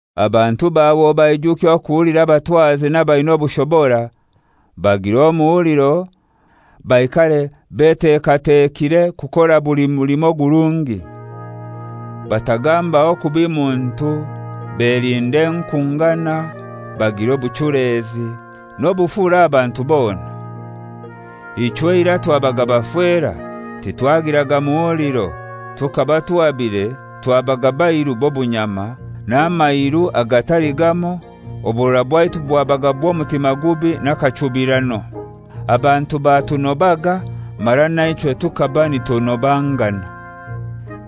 Abantu bawe obaijukye okuhulira abatwazi n'abaina obushobora, bagire omuhuliro, baikare betekatekire kukora buli mulimo ogurungi. Batagambaho kubi muntu, belinde enkungana, bagire obuchulezi n'obufura aha bantu bona. Ichwe eirai twabaga bafera, titwagiraga muhuliro, tukaba tuhabire, twabaga bairu b'obunyama, n'amairu agatali gamoi, oburora bwaitu bwabaga bw'omutima gubi n'akachubirano, abantu batunobaga mara naichwe tukaba nitunobangana.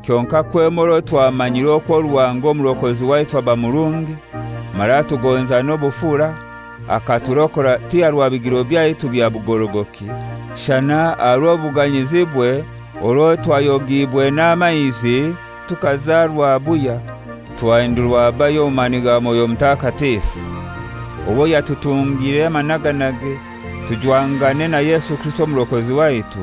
Kyonkai kwema orwo twamanyire okwo Ruhanga Omurokozi waitu aba murungi mara atugonza n'obufura, akaturokora ti aha rwa bigiro byaitu bya bugorogoki, shana aha rw'obuganyizibwe orwo twayogiibwe n'amaizi tukazarwa buhya twahindurwa bahya omu mani ga Mwoyo Mutakatifu, owo yatutungire amanaganage tujwangane na Yesu Kirisito Omurokozi waitu,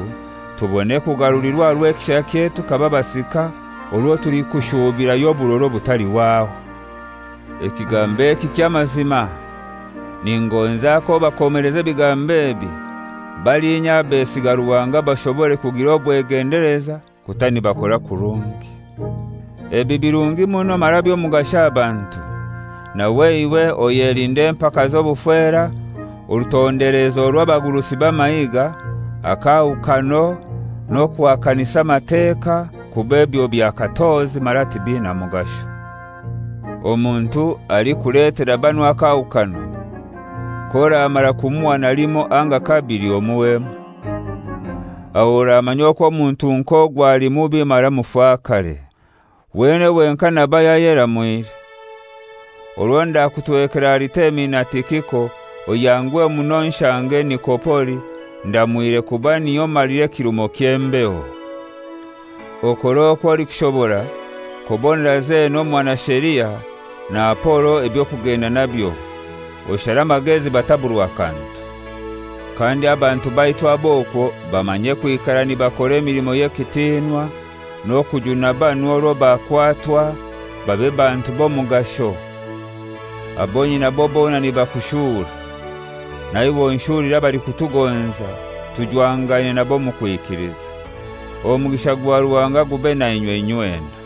tubone kugarulirwa aha rw'ekishakye tukaba basika orwo tulikushuubirayo oburora obutalihwaho. Ekigambo eki ky'amazima. Ningonza k'obakomeleza ebigambo ebi, balinya abesiga Ruhanga bashobore kugira obwegendeleza kuta nibakora kurungi. Ebi birungi muno mara by'omugasho aha bantu. Nawe iwe oyelinde empaka z'obufera, orutondelezo rw'abagurusi b'amahiga, akahukano, n'okuhakanisa amateka, kuba ebyo bya katozi mara tibina mugasho. Omuntu alikuletera banu akaahukano, k'oramara kumuhana limoi anga kabili, omuhwemu. Aho oramanya okwo omuntu nk'ogwo ali mubi mara mufakare. Wenene wenkai naba yayeramwire. Orwo ndakutwekera Aritemi na Tikiko, oyanguhe muno onshange Nikopoli, ndamwire kuba niyo malira ekirumo ky'embeho. Okore okwo olikushobora kubonera Zena omubuya w'amateeka, na Apolo eby'okugenda nabyo; oshare amagezi bataburwa kantu. Kandi abantu baitu ab'okwo bamanye kwikara nibakora emilimo y'ekitinwa n'okujuna banu orwo bakwatwa, babe bantu b'omugasho. Abo nyinabo bona nibakushura. Naiwe onshulire abalikutugonza tujwangaine nabo omu kwikiliza. Omugisha gwa Ruhanga gube nainywe inywena.